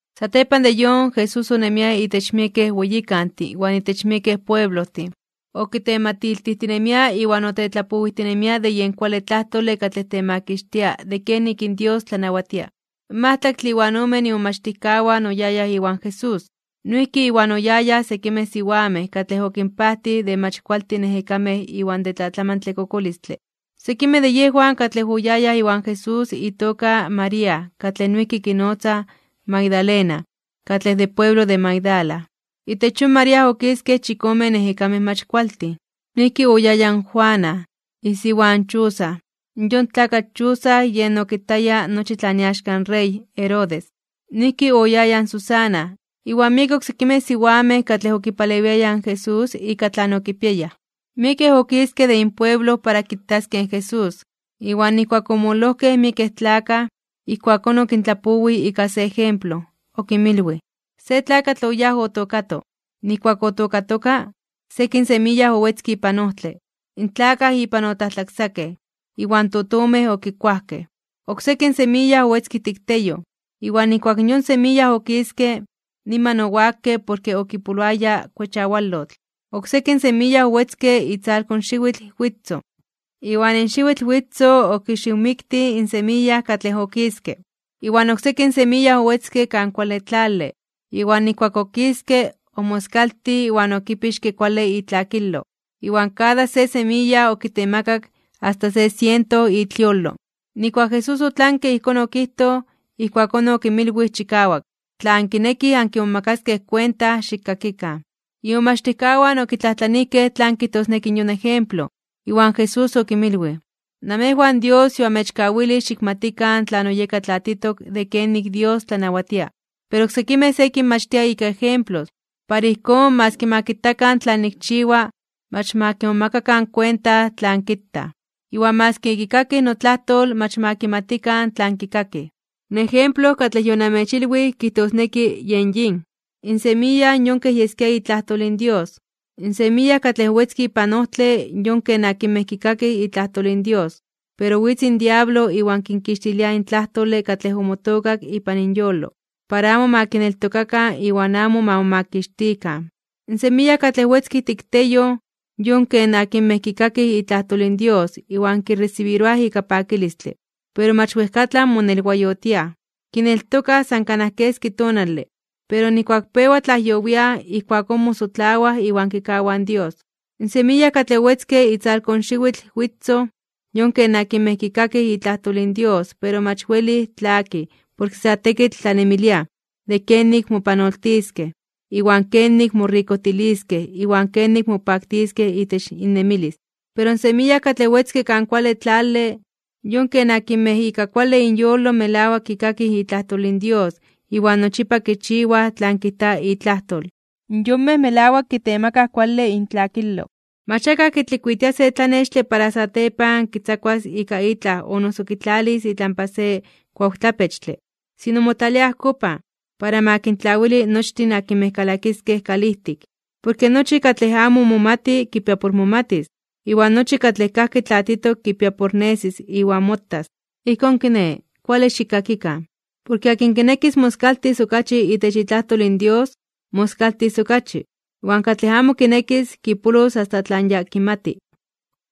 Satepan de yon, Jesús onemia itech miekej weyikantin iwan itech miekej pueblojtin, okitematiltijtinemia iwan otetlapowijtinemia de yen kuale tlajtole katlej temakixtia de kenik Dios tlanawatia. In majtlaktle iwan omen imomachtijkawan oyayaj iwan Jesús. Noijki Iwan oyayaj sekimej siwamej katlej okinpajtij de mach kualtin ejekamej iwan de tlatlamantle kokolistle. Sekimej de yejwan katlej oyayaj iwan Jesús itoka María katlej noijki kinotzaj Magdalena katlej de pueblo de Magdala. Itech yon María okiskej chikomen ejekamej mach kualtin. Noijki oyaya in Juana, isiwa in Chuza, yon tlakatl Chuza yej okitaya nochi tlan iaxka in rey Herodes. Noijki oyaya in Susana, iwan miekej oksekimej siwamej katlej okipalewiayaj in Jesús ika tlan okipiayaj. Miekej okiskej de inpueblo para kitaskej in Jesús. Iwan nijkuak omololojkej miekej tlakaj, ijkuakón okintlapowij ika se ejemplo. Okinmilwij: ―Se tlakatl oyáj otookato. Nijkuak otookatoka, sekin semiya owetzke ipan ojtle. In tlakaj ipan otlajtlaksakej, iwan totomej okikuajkej. Oksekin semiya owetzke ijtik teyoj. Iwan nijkuak yon semiya okiske, niman owakke porke okipoloaya kuechawalotl. Oksekin semiya owetzke itzalko xiwitl witzoj, iwan in xiwitl witzoj okixiwmiktij in semiya katlej okiske. Iwan oksekin semiya owetzke kan kuale tlale. Iwan nijkuak okiske, omoskaltij iwan okipixke kuale itlakilo, iwan kada se semiya okitemakak asta se siento itliolo. Nijkuak Jesús otlanke ijkón okijtoj, ijkuakón okinmilwij chikawak: ―Tla ankinekij ankimomakaskej kuenta, xikkakikan. Imomachtijkawan okitlajtlanijkej tlan kijtosneki yon ejemplo. Iwan Jesús okinmilwij: ―Namejwan Dios yoamechkawilij xikmatikan tlan oyeka tlatitok de kenik Dios tlanawatia. Pero oksekimej se kinmachtia ika ejemplos, para ijkón, maski ma kitakan tlan nikchiwa, mach ma kimomakakan kuenta tlan kitaj. Iwan maski ma kikakikan notlajtol, mach ma kimatikan tlan kikakij. ’In ejemplo katlej yonamechilwij kijtosneki yen yin: In semiya yon kej yeskia itlajtol in Dios. In semiya katlej owetzke ipan ojtle yon ken akinmej kikakij itlajtol in Dios, pero witz in diablo iwan kinkixtilia in tlajtole katlej omotookak ipan inyolo, para amo ma kineltokakan iwan amo ma momakixtikan. In semiya katlej owetzke ijtik teyoj, yon ken akinmej kikakij itlajtol in Dios iwan kiresibiroaj ika pakilistle, pero mach wejkatlan monelwayotiaj. Kineltokaj san kanaj keski tonale, pero nijkuak pewa tlajyowiaj ijkuakón mosotlawaj iwan kikawaj in Dios. In semiya katlej owetzke itzalko in xiwitl witzoj, yon ken akinmej kikakij itlajtol in Dios pero mach welij tlakij porke sa tekitl tlanemiliaj de kenik mopanoltiskej, iwan kenik morikojtiliskej iwan kenik mopaktiskej itech innemilis. Pero in semiya katlej owetzke kan kuale tlale, yon ken akinmej ika kuale inyolo melawak kikakij itlajtol in Dios iwan nochipa kichiwaj tlan kijta itlajtol. Yonmej melawak kitemakaj kuale intlakilo. ’Mach akaj kitlikuitia se tlanextle para satepan kixtzakuas ika itlaj o noso kitlalis itlampa se kuawtlapechtle, sino motlalia ajkopan, para ma kintlawili nochtin akinmej kalakiskej kalijtik. Porke nochi katlej amo momati kipia por momatis, iwan nochi katlej kajki tlatitok kipia por nesis iwan motas. ’Ijkón kiné, kuale xikkakikan. Porke akin kinekis moskaltis okachi itech itlajtol in Dios, moskaltis okachi. Iwan katlej amo kinekis, kipolos asta tlan ya kimati.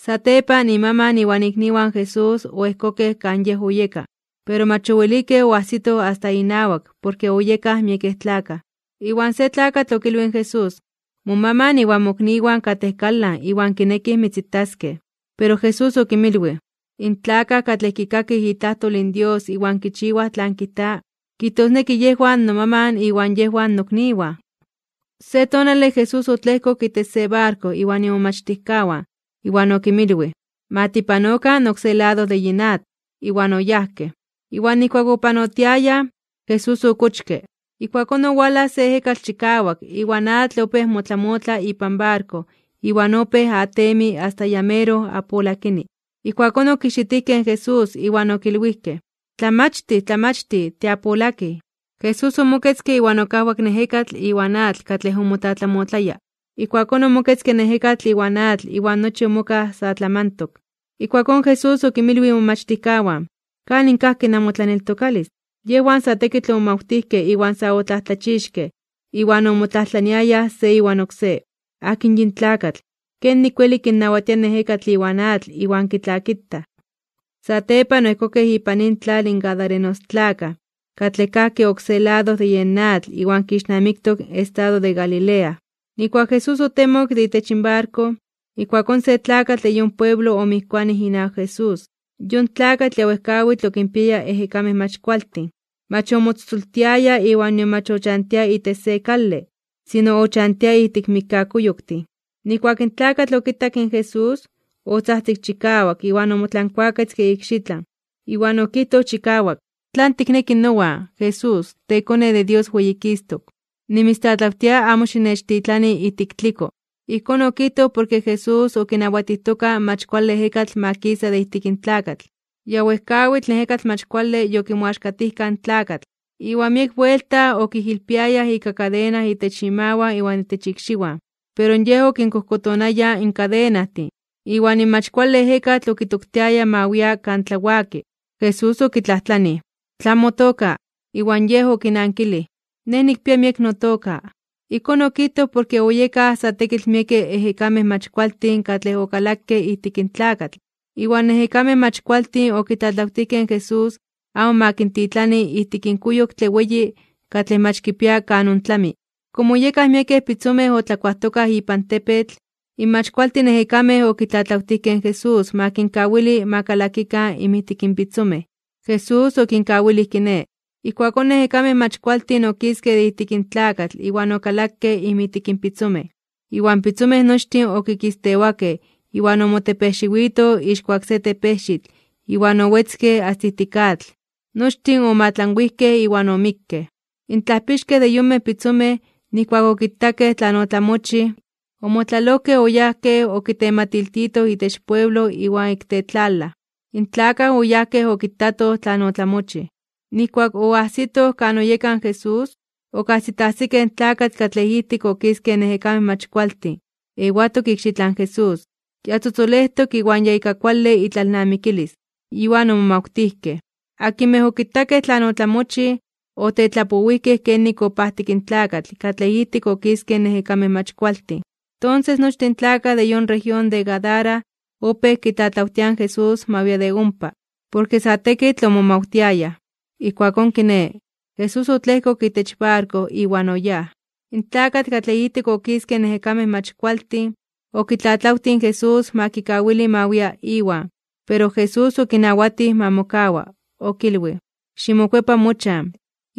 Satepan imaman iwan ikniwan Jesús oejkokej kan Yej oyeka, pero mach owelikej oasitoj asta inawak porke oyekaj miekej tlakaj. Iwan se tlakatl okilwij in Jesús: ―Momaman iwan mokniwan katej kalan iwan kinekij mitzitaskej. Pero Jesús okinmilwij: ―In tlakaj katlej kikakij itlajtol in Dios iwan kichiwaj tlan kijta, kijtosneki yejwan nomaman iwan yejwan nokniwan. Se tonale Jesús otlejkok itech se barko iwan imomachtijkawan, iwan okinmilwij: ―Ma tipanokan oksé lado de yin atl. Iwan oyajkej. Iwan nijkuak opanotiayaj, Jesús okochke. Ijkuakón owalaj se ejekatl chikawak iwan atl opéj motlamotla ipan barko iwan opéj atemi asta ya meroj apolakini. Ijkuakón okijxitijkej in Jesús, iwan okilwijkej: ―¡Tlamachtij! ¡Tlamachtij! ¡Tiapolakij! Jesús omoketzke iwan okajwak in ejekatl iwan atl katlej omotlatlamotlaya. Ijkuakón omoketzke in ejekatl iwan atl iwan nochi omokaj sa tlamantok. Ijkuakón Jesús okinmilwij imomachtijkawan: ―¿Kanin kajki namotlaneltokalis? Yejwan sa tekitl omomawtijkej iwan sa otlajtlachixkej (omomajmawtijkej), iwan omotlajtlaniayaj se iwan oksé: ―¿Akin yin tlakatl? ¿Kenik weli kinnawatia in ejekatl iwan atl iwan kitlakitaj? Satepan oejkokej ipan intlal in gadarenostlakaj, katlej kajki oksé lado de yen atl iwan kixnamiktok in estado de Galilea. Nijkuak Jesús otemok de itech barko, ijkuakón se tlakatl de yon pueblo omijkuanij inawak Jesús. Yon tlakatl ya wejkawitl okinpiaya ejekamej mach kualtin. Mach omotzotzoltiaya iwan nion mach ochantia itech se kale, sino ochantia ijtik mikkakuyoktin. Nijkuak in tlakatl okitak in Jesús, otzajtzik chikawak iwan omotlankuaketzke ikxitlan, iwan okijtoj chikawak: ―¿Tlan tikneki nowan, Jesús, teKone de Dios Weyikistok (Weyititok)? Nimitztlatlawtia amo xinechtitlani ijtik tliko. Ijkón okijtoj porke Jesús okinawatijtoka in mach kuale ejekatl ma kisa de ijtik in tlakatl. Ya wejkawitl in ejekatl mach kuale yokimoaxkatijka in tlakatl. Iwan miek buelta okijilpiayaj ika kadena itech imawan iwan itech ikxiwan. Pero yej okinkojkotonaya in kadenajtin, iwan in mach kuale ejekatl okitoktiaya ma wia kan tlawaki. Jesús okitlajtlanij: ―¿Tlan motoka? Iwan yej okinankilij: ―Nej nikpia miek notoka. Ijkón okijtoj porke oyekaj sa tekitl miekej ejekamej mach kualtin katlej okalakej ijtik in tlakatl. Iwan in ejekamej mach kualtin okitlatlawtijkej in Jesús amo ma kintitlani ijtik in kuyoktle weyi katlej mach kipia kan ontlami. Komo oyekaj miekej pitzomej otlakuajtokaj ipan tepetl, in mach kualtin ejekamej okitlatlawtijkej in Jesús ma kinkawili ma kalakikan inmijtik in pitzomej. Jesús okinkawilij kiné. Ijkuakón in ejekamej mach kualtin okiskej de ijtik in tlakatl iwan okalakej inmijtik in pitzomej, iwan pitzomej nochtin okikistewakej iwan omotepejxiwitoj ixkuak se tepejxitl iwan owetzkej asta ijtik atl, nochtin omoatlanwijkej iwan omikkej. In tlajpixkej de yonmej pitzomej, nijkuak okitakej tlan otlamochij, omotlalojkej oyajkej okitematiltitoj itech pueblo iwan ik tetlalaj. In tlakaj oyajkej okitatoj tlan otlamochij. Nijkuak oajsitoj kan oyeka in Jesús, okajsitajsikej in tlakatl katlej ijtik okiskej in ejekamej mach kualtin, ewatok ikxitlan Jesús. Ya tzotzolejtok iwan ya ika kuale itlalnamikilis. Iwan omomajmawtijkej. Akinmej okitakej tlan otlamochij, otetlapowijkej kenik opajtik in tlakatl katlej ijtik okiskej in ejekamej mach kualtin. Tonses nochtin in tlakaj de yon región de Gadara opéj kitlatlawtiaj in Jesús ma wia de ompa, porke sa tekitl omomawtiayaj. Ijkuakón kiné, Jesús otlejkok itech barko iwan oyáj. In tlakatl katlej ijtik okiskej in ejekamej mach kualtin, okitlatlawtij in Jesús ma kikawili ma wia Iwan, pero Jesús okinawatij ma mokawa. Okilwij: ―Ximokuepa mochan,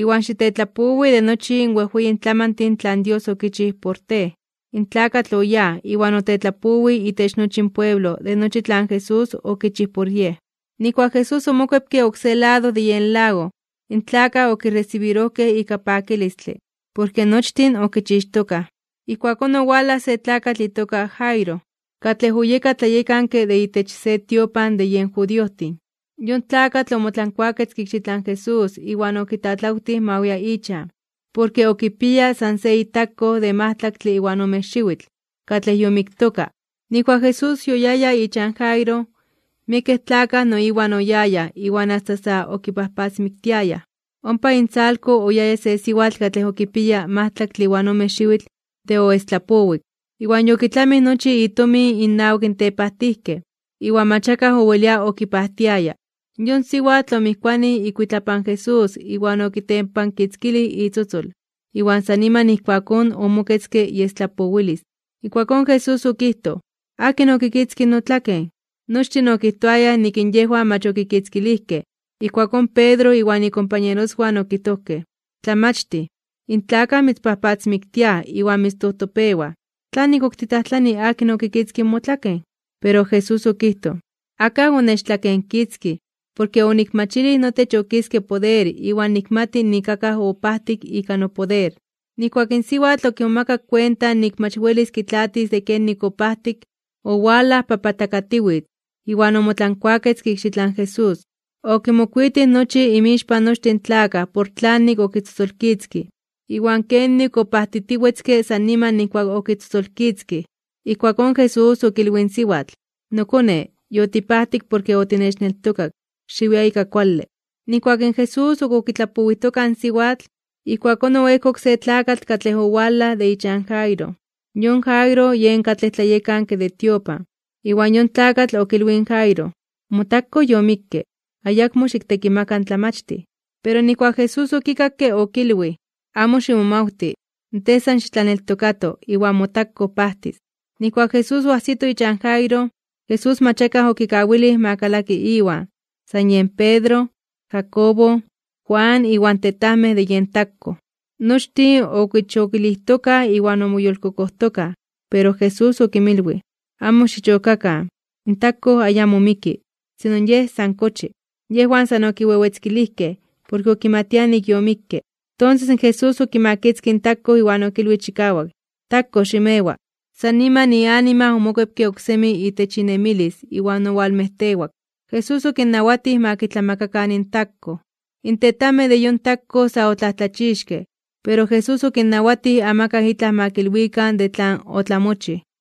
iwan xitetlapowi de nochi in wejweyin tlamantin tlan Dios okichij por tej. In tlakatl oyáj, iwan otetlapowij itech nochi in pueblo de nochi tlan Jesús okichij por yej. Nijkuak Jesús omokuepke oksé lado de yen lago, in tlakaj okiresibirojkej ika pakilistle. Porke nochtin okichixtokaj. Ijkuakón owalaj se tlakatl itoka Jairo, katlej oyeka tlayekanke de itech se tiopan de yen judiojtin. Yon tlakatl omotlankuaketzke ikxitlan Jesús iwan okitlatlawtij ma wia ichan, porke okipiaya san se itakkoj de majtlaktle iwan ome xiwitl, katlej yomiktoka. Nijkuak Jesús yoyaya ichan Jairo, miekej tlakaj no Iwan oyayaj iwan asta sa okipajpatzmiktiayaj. Ompa intzalko oyaya se siwatl katlej okipiaya majtlaktle iwan ome xiwitl de oestlapowik, iwan yokitlamij nochi itomin innawak in tepajtijkej, iwan mach akaj owelia okipajtiaya. Yon siwatl omijkuanij ikuitlapan Jesús iwan okitempankitzkilij itzotzol, iwan san niman ijkuakón omoketzke iestlapowilis. Ijkuakón Jesús okijtoj: ―¿Akin okitzkij notlaken? Nochtin okijtoayaj nik in yejwan mach okikitzkilijkej, ijkuakón Pedro iwan ikompañeroswan okijtojkej: ―Tlamachtij, in tlakaj mitzpajpatzmiktiaj iwan mitztojtopewaj, ¿tlanik ok titlajtlani akin okitzkij motlaken? Pero Jesús okijtoj: ―Akaj onechtlakenkitzkij. Porke onikmachilij notech okiske poder iwan nikmati nik akaj opajtik ika nopoder. Nijkuak in siwatl okimomakak kuenta nik mach welis kitlaatis de kenik opajtik, owalaj papatlakatiwitz (bibiokatiwitz) iwan omotlankuaketzke ikxitlan Jesús. Okimokuitij nochi inmixpan nochtin tlakaj por tlanik okitzotzolkitzkij, iwan kenik opajtitiwetzke san niman nijkuak okitzotzolkitzkij. Ijkuakón Jesús okilwij in siwatl: ―Nokone, yotipajtik porke otinechneltokak. Xiwia ika kuale. Nijkuak in Jesús ok okitlapowijtoka in siwatl, ijkuakón oejkok se tlakatl katlej owalaj de ichan Jairo, yon Jairo yen katlej tlayekanke de tiopan, iwan yon tlakatl okilwij in Jairo: ―Motakkoj yomikke. Ayakmo xiktekimaka in Tlamachtij. Pero nijkuak Jesús okikakke, okilwij: ―Amo ximomawti. Tej san xitlaneltokato, iwan motakkoj pajtis. Nijkuak Jesús oajsito ichan Jairo, Jesús mach akaj okawilij ma kalaki Iwan, san yen Pedro, Jacobo, Juan iwan tetajmej de yen takkoj. Nochtin okichokilijtokaj iwan omoyolkokojtokaj. Pero Jesús okinmilwij: ―Amo xichokakan. In takkoj ayamo miki, sino yej san kochi. Yejwan san okiwewetzkilijkej, porke okimatiaj nik yomikke. Tonses in Jesús okimakitzkij in takkoj iwan okilwij chikawak: ―Takkoj, ximewa. San niman ianima omokuepke oksemi itech inemilis iwan owalmejtewak. Jesús okinnawatij ma kitlamakakan in takkoj. In tetajmej de yon takkoj sa otlajtlachixkej (omomajmawtijkej). Pero Jesús okinnawatij amakaj itlaj ma kilwikan de tlan otlamochij.